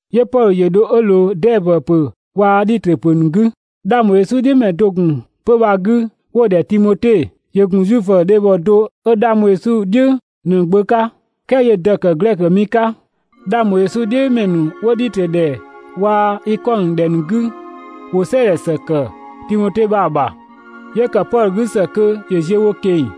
'Yö Pɔdhö ‑yö dho 'ö ꞊loo Dɛɛbö ‑pö waa‑ Dhitrö ‑pö ‑nu 'gü. 'Dhang ‑bho Yesu "dhiʋ̈ ‑mɛ do ‑yö ‑gun 'pö‑ bha‑ 'gü 'wo‑ ‑dhɛ Timote. ‑Yö ‑gun Zuifö dhebhɔ do 'ö 'dhang bho Yesu "dhiʋ̈ ꞊në‑ gbö 'ka, "kɛɛ 'yö‑ dë ‑zë 'ö ‑kë Glɛkö mi 'ka. 'Dhang ‑bho Yesu "dhiʋ̈ ‑mɛ ‑nu 'wo Dhitrö ‑dhɛ waa‑ Ikɔnö ‑dhɛ ‑nu 'gü ‑wo ‑gun "sɛɛdhɛ ‑së kë sië Timote bha‑ ‑bha. 'Yö ‑kë Pɔdhö 'gü ‑së kö ‑yö ziö wo ꞊keng‑,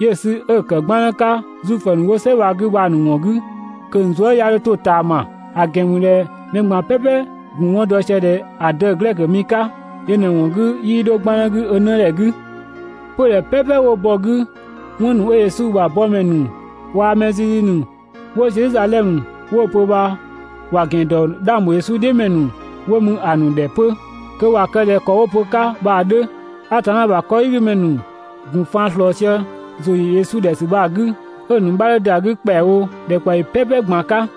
'yö‑ sü 'ö‑ ‑kë 'gbannë 'ka Zuifö ‑nu 'wo "sɛ bha‑ 'gü bha‑ ‑nu ‑wɔn 'gü kö‑ ‑nu zuë" 'ya 'dho 'to ꞊taama, ‑a ‑gɛn ‑mü ꞊dhɛ mɛ ꞊gban "pɛpɛ‑ ‑gun 'wɔn dɔ sië ꞊dhɛ ‑a dë‑ Glɛkö mi 'ka, (yö ꞊në‑ ‑wɔn 'gü 'yö 'yii 'dho 'gbannë 'gü ö 'nëdhɛ 'gü). 'Pödhɛ "pɛpɛ 'wo bɔ‑ 'gü, 'wɔn ‑nu 'ö Yesu ‑bha yëkëmɛ ‑nu waa‑ mɛ zizi ‑nu 'wo Zedhizadhɛmö 'wo‑ pö bha ‑wa ‑gɛn ‑dɔ 'dhang ‑bho Yesu "dhiʋ̈ ‑mɛ ‑nu 'wo mü ‑a ‑nu ‑dhɛ 'pö kö ‑wa kë ꞊dhɛ ‑kɔ 'wo‑ pö‑ 'ka bha‑ 'dhö. Atanna ‑bha 'kɔdhigümɛ ‑nu ‑gun faan ꞊slɔɔ sië ‑zʋ ‑yö Yesu ‑dhɛ ‑sü bha‑ 'gü, 'ö‑ ‑nu 'bha 'dhö ‑da 'gü ‑kpɛawo ‑dhɛkpaɔyi "pɛpɛ ꞊gban‑ 'ka.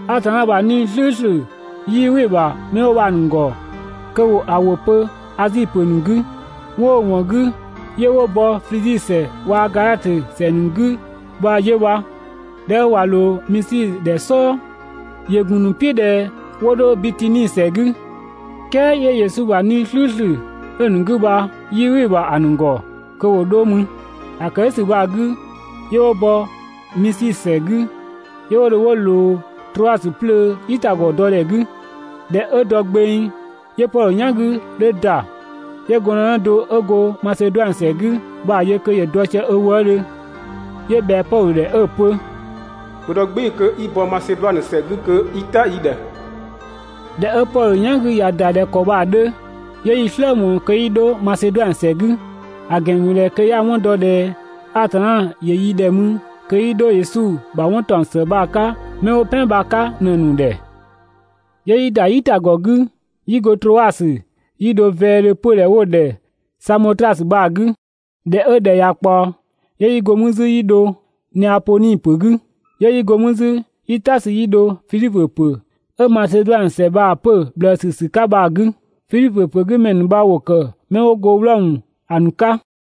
Atanna ‑bha 'Nii‑ "slʋ̈ʋ̈slʋ̈ 'yii "wɩ‑ ‑bha 'mɛ 'wo bha‑ ‑nu ‑gɔ kö ‑wo ‑a ‑wʋ pö Azi ‑pö ‑nu 'gü. 'Wɔn 'ö‑ ‑wɔn 'gü 'yö 'wo bɔ Flizi ‑sɛ waa‑ Gadhatö ‑sɛ ‑nu ꞊në‑ 'gü bha 'yö bha. ꞊Dhɛ 'ö ꞊wa ꞊loo Misi ‑dhɛ "sɔɔ, ‑yö ‑gun ‑nu "piʋ̈ ꞊dhɛ 'wo 'dho Bitini ‑sɛ 'gü, "kɛɛ Yesu ‑bha 'Nii‑ "slʋ̈ʋ̈slʋ̈ 'ö‑ ‑nu 'gü bha 'yii "wɩ‑ ‑bha ‑a ‑nu ‑gɔ kö ‑wo 'dho mü. ‑A ‑kë "dhʋ̈ ‑sü bha‑ 'gü 'yö 'wo bɔ Misi ‑sɛ 'gü, 'yö 'wo dho 'wo ꞊loo Troasö 'plöö "yitagɔ dɔdhɛ 'gü. ꞊Dhɛ 'ö dɔ gbeng, 'yö Pɔdhö "yan 'gü 'dhö ‑da, 'yö gɔndënë do 'ö go Maseduanö ‑sɛ 'gü bha‑ yö kö ‑yö dɔ sië ö wëëdhö, 'yö ꞊bhɛa Pɔdhö ‑dhɛ 'ö‑ pö: «‑Bhö dɔ "gbɩɩ‑ kö 'i bɔ Maseduanö ‑sɛ 'gü kö i "ta yi ‑dhɛ!» ꞊Dhɛ 'ö Pɔdhö "yan 'gü ‑ya ‑da ꞊dhɛ ‑kɔ bha‑ 'dhö, 'yö 'yi‑ "slë ꞊mɔɔ kö 'yi 'dho Maseduanö ‑sɛ 'gü, ‑a ‑gɛn ‑mü ꞊dhɛ kö 'ya‑ 'wɔn dɔ ꞊dhɛ Atanna ‑yö yi ‑dhɛ mü kö 'yi 'dho Yesu ‑bha 'wɔn ‑taɔng ‑së bha‑ 'ka 'mɛ 'wo "pɛan bha‑ 'ka ꞊në‑ ‑nu ‑dhɛ. 'Yö yi ‑da "yitagɔ 'gü 'yi go Troasö 'yi dho vɛɛdhö 'pödhɛ 'wo‑ ‑dhɛ Samotrasö bha‑ 'gü. ꞊Dhɛ 'ö ‑dhɛ ꞊ya ꞊kpaɔ, 'yö 'yi go 'mü 'zü 'yi dho Neapodhi ‑pö 'gü. 'Yö 'yi go mü 'zü 'yi "ta sü 'yi dho Fidhipö ‑pö 'ö Maseduanö ‑sɛ bha‑ 'pö‑ ꞊bhlëësü ‑sü 'ka bha‑ 'gü. Fidhipö ‑pö 'gü ‑mɛ ‑nu bha ‑wo ‑kë 'mɛ 'wo go Wlɔmö ‑a ‑nu 'ka.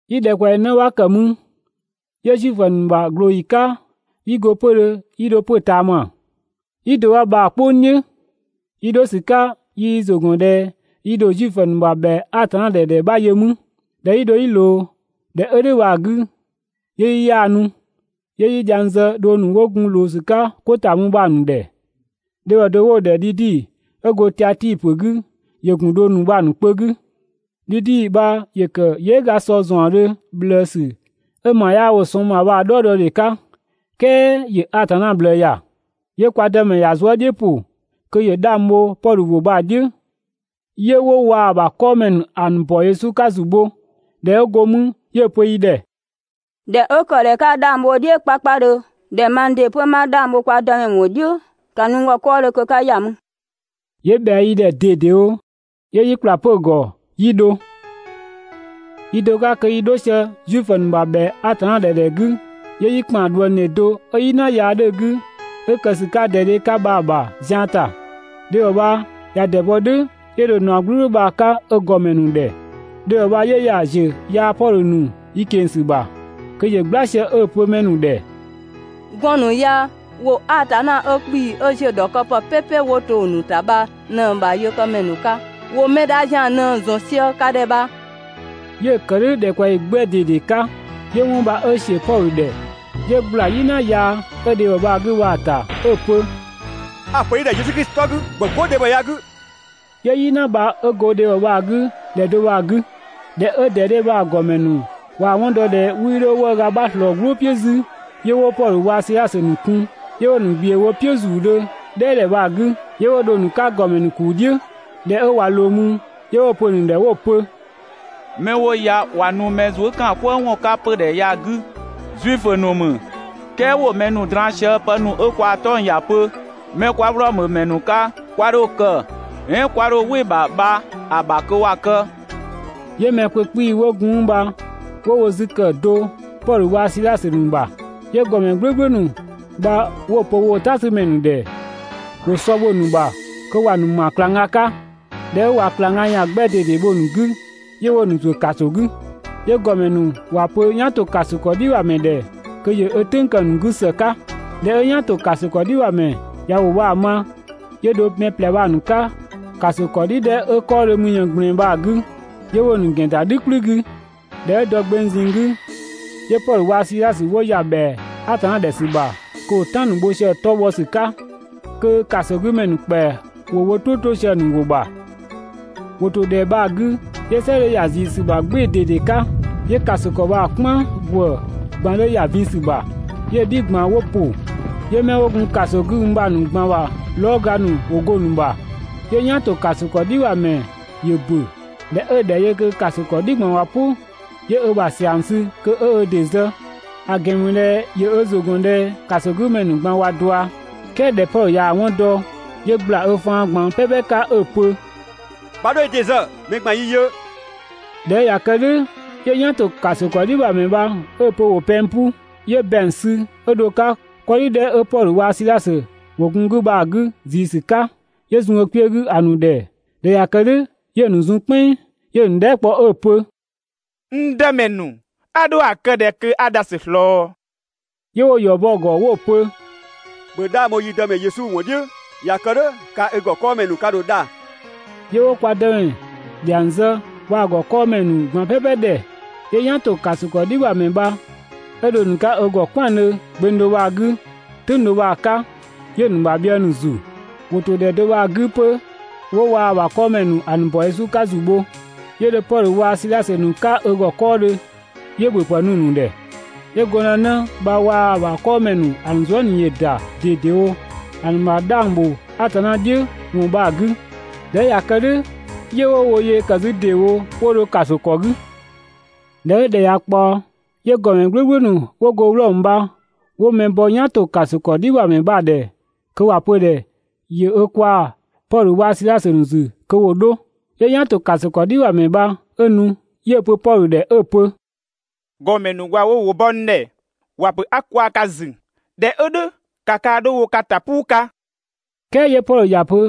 Yi ‑dhɛkpaɔyi 'në 'bha ‑kë mü. 'Yö Zuifö ‑nu ‑bha ꞊glooyi 'ka 'yi go 'pödhö 'yi dho 'pö ꞊taama, "yi do 'bha bha‑ "kpʋng "dhiʋ̈. Yi 'dho ‑sü 'ka yi yi ‑zʋ ‑gɔn ꞊dhɛ yi ‑dho Zuifö ‑nu ‑bha ‑bhɛa Atanna ‑dhɛ ‑dhɛ 'bha yö ‑mü. ꞊Dhɛ 'yi dho 'yi ꞊loo ‑dhɛ 'ö "dhʋ̈ bha‑ 'gü, 'yö yi 'yaanu, 'yö 'yi dhiang zë dhong ‑nu 'wo gun ꞊loo ‑sü 'ka 'ko ‑ta mü bha‑ ‑nu ‑dhɛ. Dhebhɔ do 'wo‑ ‑dhɛ Dhidi 'ö go Tiatii ‑pö 'gü ‑yö ‑gun dhong ‑nu bha‑ ‑nu kpö 'gü. Dhidi bha ‑yö ‑kë yɩɩga sɔ ‑zaɔndhö ꞊bhlëësü 'ö ‑ma 'yaa wo‑ sɔng ‑bha bha‑ "dhɔɔdɔdhe 'ka, "kɛɛ ‑yö Atanna ꞊bhlëë ‑ya. 'Yö kwa Dëmɛ ‑ya zuë" "dhiʋ̈ ‑pʋ kö ‑yö 'dhang bho Pɔdhö ‑wʋ bha‑ "dhiʋ̈. 'Yö 'wo waa‑ ‑bha 'kɔɔmɛ ‑nu ‑a ‑nu ‑bɔ Atanna 'ka ‑zu bho. ꞊Dhɛ 'ö go 'mü, 'yö‑ pö yi ‑dhɛ: «꞊Dhɛ 'ö ‑kë ꞊dhɛ 'ka 'dhang bho‑ "dhiʋ̈ 'kpakpadhö ꞊dhɛ mang ‑dɩ 'pö 'ma 'dhang bho kwa Dëmɛ ‑wɔn "dhiʋ̈ bha, ‑ka nu n ‑gɔ 'kɔɔdhö kö 'ka ‑ya mü.» 'Yö ꞊bhɛa yi ‑dhɛ ꞊dedewo, 'yö 'yi ‑kpla 'pö‑ ‑gɔ 'yi dho. Yi do 'ka kö yi 'dho sië Zuifö ‑nu ‑bha ‑bhɛa Atanna ‑dhɛ ‑dhɛ 'gü, 'yö 'yi ꞊dhuëngdhe do 'ö "yina yaa 'dhö‑ 'gü, 'ö‑ kë ‑sü 'ka ‑dɛdhe 'ka bha‑ yö zian ‑ta. Dhebhɔ bha ꞊ya ‑dɛbɔ "dhʋ̈ 'yö dho‑ ‑naɔ "gblʋ̈gblʋ̈ bha‑ 'ka ö ‑gɔmɛ ‑nu ‑dhɛ. Dhebhɔ bha 'yö ‑ya ‑ziö yaa‑ Pɔdhö ‑nu yi ꞊keng‑ ‑sü ‑bha kö ‑yö "gbla sië 'ö‑ pö mɛ ‑nu ‑dhɛ: «Gɔɔn‑ ‑nu ya ‑wo Atanna 'ö 'kpii‑ 'ö ‑ziö ‑dhɔkëpë "pɛpɛ 'wo to‑ ‑nu ‑ta bha ꞊në‑ ‑bha yëkëmɛ ‑nu 'ka! ‑Wo mɛ dha ‑zian ꞊në ‑zɔn sië ka ‑dhɛ bha.» 'Yö‑ ‑kë "dhʋ̈ ‑dhɛkpaɔyi 'gbɛ ꞊dede 'ka. 'Yö 'wɔn bha 'ö ꞊sië Pɔdhö ‑dhɛ 'yö ꞊gbla "yina yaa 'ö dhebhɔ bha‑ 'gü bha‑ ‑ta 'ö‑ pö: «A‑ ‑pö i ‑dhɛ Yesu Klisi 'tɔ 'gü, ‑bhö 'go dhebhɔ ya‑ 'gü!» 'Yö "yina bha 'ö go dhebhɔ bha‑ 'gü ‑dhɛ do bha‑ 'gü. ꞊Dhɛ 'ö ‑dɛdhe bha‑ ‑gɔmɛ ‑nu ꞊waa‑ 'wɔn dɔ ꞊dhɛ 'wii 'dho 'wëëga 'bha ꞊slɔɔ‑ "gblʋʋ "piʋ̈ 'zü, 'yö 'wo Pɔdhö waa‑ Sidhasö ‑nu kun, 'yö 'wo‑ ‑nu ꞊gbiʋ̈ wo "piʋ̈ ‑zuudhö "dhɛɛdhɛ bha‑ 'gü, ‑gɔmɛ "gblʋ̈gblʋ̈ ‑nu 'wo go Wlɔmö 'wo gun 'pö bha‑ ‑gɔ "dhiʋ̈ bha‑ ‑nu ‑kuu "dhiʋ̈. ꞊Dhɛ 'ö ꞊wa ꞊loo mü, 'yö 'wo‑ pö‑ ‑nu ‑dhɛ 'wo‑ pö: «'Mɛ 'wo ya ꞊wa nu mɛ zuë" ‑kaan "kwëë ‑wɔn 'ka 'pödhɛ ya‑ 'gü! Zuifö ‑nu ‑mü "kɛɛ ‑wo mɛ ‑nu draan‑ sië pë ‑nu 'ö kwaa‑ 'tɔng‑ ‑ya pö 'mɛ 'kwa Wlɔmö ‑mɛ ‑nu 'ka, 'kwa 'dho‑ kë "ɛɛn 'kwa 'dho "wɩ‑ ‑bha bha‑ ‑bha kö ‑wa kë.» 'Yö mɛ kpö 'kpii‑ 'wo gun 'mü bha 'wo wo 'zü ‑kë do Pɔdhö waa‑ Sidhasö ‑nu ‑dhɛ. 'Yö ‑gɔmɛ "gblʋ̈gblʋ̈ ‑nu bha 'wo‑ pö woo‑ "tasümɛ ‑nu ‑dhɛ ‑wo sɔ bho‑ ‑nu ‑bha kö ‑wa ‑nu ‑ma ꞊klangga 'ka. ꞊Dhɛ 'ö ꞊wa ꞊klangga ‑yan 'gbɛ ꞊dede bho‑ ‑nu 'gü, 'yö 'wo‑ ‑nu ‑zuö ‑kaso 'gü. 'Yö ‑gɔmɛ ‑nu ‑wa pö "yan ‑to ‑kaso ‑kɔ "dhi ‑bha ‑mɛ ‑dhɛ kö ‑yö ö "tʋ̈ng kë‑ ‑nu 'gü ‑së 'ka. ꞊Dhɛ 'ö "yan ‑to ‑kaso ‑kɔ "dhi ‑bha ‑mɛ ꞊ya ‑wʋ bha‑ ma, 'yö dho mɛ ꞊plɛ bha‑ ‑nu 'ka ‑kaso ‑kɔdhi 'dhɛ 'ö 'kɔɔdhö mü ꞊yën ꞊gblɛɛn bha‑ 'gü, 'yö 'wo‑ ‑nu ‑gɛn ‑da "dhü "kplü 'gü. ꞊Dhɛ 'ö dɔ gbeng ꞊zinng 'gü, 'yö Pɔdhö waa‑ Sidhasö 'wo ‑ya ‑bhɛa Atanna ‑dhɛ ‑sü ‑bha kö ‑wo "tan ‑nu bho sië‑ 'tɔ bhɔ ‑sü 'ka, kö ‑kasogümɛ ‑nu ‑kpɛa ‑wo wo "tʋ 'to sië‑ ‑nu ‑wʋ ‑bha. ‑Wo ‑to ‑dhɛ bha‑ 'gü 'yö "sɛ 'dhö ‑ya ꞊zii ‑sü ‑bha "gbɩɩ‑ ꞊dede 'ka, 'yö ‑kaso ‑kɔ bha‑ "kpan ‑gwë ꞊gban 'dhö ‑ya vin ‑sü ‑bha, 'yö‑ "dhi ꞊gban 'wo ‑pʋ, 'yö 'mɛ 'wo gun ‑kaso 'gü mü bha‑ ‑nu ꞊gban ‑bha lɔɔga ‑nu ‑wo go‑ ‑nu ‑bha. 'Yö "yan ‑to ‑kaso ‑kɔdhi ‑bha ‑mɛ ‑yö ‑bö. ꞊Dhɛ 'ö‑ ‑dhɛ yö kö ‑kaso ‑kɔdhi ꞊gban ꞊wa "pʋ, 'yö ö ‑bha ‑siang sü kö 'ö ö ‑dɩ zë, ‑a ‑gɛn ‑mü ꞊dhɛ ‑yö ö ‑zʋ gɔn ꞊dhɛ ‑kasogümɛ ‑nu ꞊gban ꞊wa ꞊dua. "Kɛɛ ꞊dhɛ Pɔdhö ꞊yaa‑ 'wɔn dɔ, 'yö ꞊gbla ö faan ꞊gban "pɛpɛ 'ka 'ö‑ pö: «'Bha 'dho i ‑dɩ zë! Mɛ ꞊gban yi yö!» ꞊Dhɛ 'ö ꞊ya kë "dhʋ̈, 'yö "yan ‑to ‑kaso ‑kɔdhi ‑bha ‑mɛ bha 'ö‑ pö ‑wo pɛng 'pu, 'yö ‑bɛang sü 'ö dho‑ 'ka 'kɔdhi 'dhɛ 'ö Pɔdhö waa‑ Sidhasö 'wo‑ 'gü bha‑ 'gü ꞊zii ‑sü 'ka, 'yö zun ö kpiö 'gü ‑a ‑nu ‑dhɛ. ꞊Dhɛ ꞊ya kë "dhʋ̈ 'yö‑ ‑nu zun "kpɛnng, 'yö‑ ‑nu dhɛɛ" kpɔ 'ö‑ pö: «N Dëmɛ ‑nu, a ‑dho ‑a kë ꞊dhɛ kö 'a dhasü ꞊slɔɔ?» 'Yö 'wo‑ ‑yɔ bɔ‑ ‑gɔ 'wo‑ pö: «‑Bhö 'dhang bho yi Dëmɛ Yesu ‑wɔn "dhiʋ̈, ꞊ya kë "dhʋ̈ kaa‑ i ‑gɔ 'kɔɔmɛ ‑nu ka ‑dho dha.» 'Yö 'wo kwa Dëmɛ ‑dhiang zë waa‑ ‑gɔ 'kɔɔdhö mɛ ꞊gban "pɛpɛ ‑dhɛ. 'Yö "yan ‑to ‑kaso ‑kɔdhi ‑bha ‑mɛ bha 'ö dho‑ ‑nu 'ka ö ‑gɔ "kwɛandhö gbeng do bha‑ 'gü, "tʋ̈ng do bha‑ 'ka, 'yö‑ ‑nu ‑bha bhië ‑nu ‑zu. ‑Wo ‑to ‑dhɛ do bha‑ 'gü 'pö 'wo waa‑ ‑bha 'kɔɔmɛ ‑nu ‑a ‑nu ‑bɔ Yesu 'ka ‑zu bho. 'Yö dho Pɔdhö waa‑ Sidhasö ‑nu 'ka ö ‑gɔ 'kɔɔdhö 'yö ‑bhöpë nu‑ ‑nu ‑dhɛ. 'Yö gɔndënë bha waa‑ ‑bha 'kɔɔmɛ ‑nu ‑a ‑nu zuë" ꞊nii ‑yö ‑da ꞊dedewo ‑a ‑nu ‑bha 'dhang ‑bho Atanna "dhiʋ̈ ‑wɔn bha‑ 'gü. (꞊Dhɛ 'ö ꞊ya kë "dhʋ̈, 'yö 'wo wo yee ‑kë 'zü ‑deewo 'wo dho ‑kaso ‑kɔɔdhö.) ꞊Dhɛ 'ö ‑dhɛ ꞊ya ꞊kpaɔ, 'yö ‑gɔmɛ "gblʋ̈gblʋ̈ ‑nu 'wo go Wlɔmö bha 'wo mɛ bɔ "yan ‑to ‑kaso ‑kɔdhi ‑bha ‑mɛ ‑dhɛ kö ‑wa pö‑ ‑dhɛ ‑yö ö kwaa‑ Pɔdhö waa‑ Sidhasö ‑nu ‑zü kö ‑wo 'dho. 'Yö "yan ‑to ‑kaso ‑kɔdhi ‑bha ‑mɛ bha 'ö nu, 'yö‑ pö Pɔdhö ‑dhɛ 'ö‑ pö: «‑Gɔmɛ ‑nu ꞊wa wo ‑wʋ bɔ n ‑dhɛ, ‑wa ‑pö 'a n kwaa‑ ka ‑zü. ꞊Dhɛ 'ö "dhʋ̈ ‑ka kaa‑ 'dho wo ka ‑ta "puu 'ka!» "Kɛɛ 'yö Pɔdhö ‑ya pö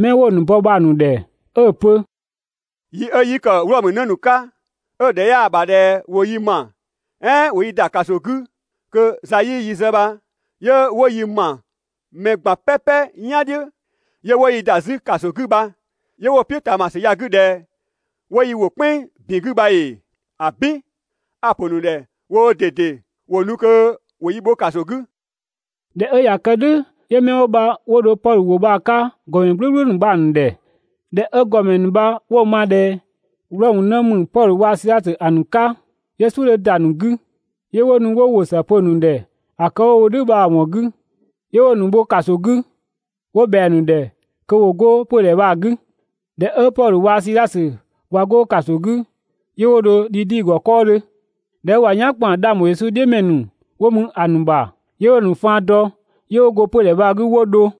mɛ 'wo‑ ‑nu bɔ bha‑ ‑nu ‑dhɛ 'ö‑ pö: «Yi 'ö 'yi ‑kë Wlɔmö 'në ‑nu 'ka ('ö‑ ‑dhɛ 'yaa‑ ‑bha ꞊dhɛ ‑wo yi ‑ma, "ɛɛn ‑wo yi ‑da ‑kaso 'gü kö za 'yii yi zë bha) 'yö 'wo yi ‑ma mɛ "pɛpɛ ꞊gban "yan "dhiʋ̈, 'yö 'wo yi ‑da 'zü ‑kaso 'gü bha 'yö 'wo‑ "piʋ̈ ꞊taamasü ya‑ 'gü ꞊dhɛ ‑wo yi ‑wo "kpɛnng ‑bin 'gü bha ‑ee? ‑Abin, ‑a pö‑ ‑nu ‑dhɛ woo ꞊dede ‑wo nu kö ‑wo yi bho ‑kaso 'gü!» ꞊Dhɛ 'ö ꞊ya kë "dhʋ̈ 'yö 'mɛ 'wo bha 'wo dho Pɔdhö ‑wʋ bha‑ 'ka ‑gɔmɛ "gblʋ̈gblʋ̈ ‑nu bha‑ ‑nu ‑dhɛ. ꞊Dhɛ 'ö ‑gɔmɛ ‑nu bha 'wo‑ ma ꞊dhɛ Wlɔmö 'në ‑mü Pɔdhö waa‑ Sidhasö ‑a ‑nu 'ka, 'yö "suʋ̈ 'dhö ‑da ‑nu 'gü 'yö 'wo nu 'wo ‑wʋ ‑së pö‑ ‑nu ‑dhɛ ‑a kë 'wo‑ wo "dhʋ̈ bha‑ ‑wɔn 'gü, 'yö 'wo‑ ‑nu bho ‑kaso 'gü 'wo ꞊bhɛa‑ ‑nu ‑dhɛ kö ‑wo 'go 'pödhɛ bha‑ 'gü. ꞊Dhɛ 'ö Pɔdhö waa‑ Sidhasö ꞊wa 'go ‑kaso 'gü, 'yö 'wo dho Dhidi ‑gɔ 'kɔɔdhö. ꞊Dhɛ 'ö ꞊wa "yan ‑kpan 'dhang ‑bho Yesu "dhiʋ̈ ‑mɛ ‑nu 'wo mü ‑a ‑nu ‑bha, 'yö 'wo‑ ‑nu faan dɔ, 'yö 'wo go 'pödhɛ bha‑ 'gü 'wo dho.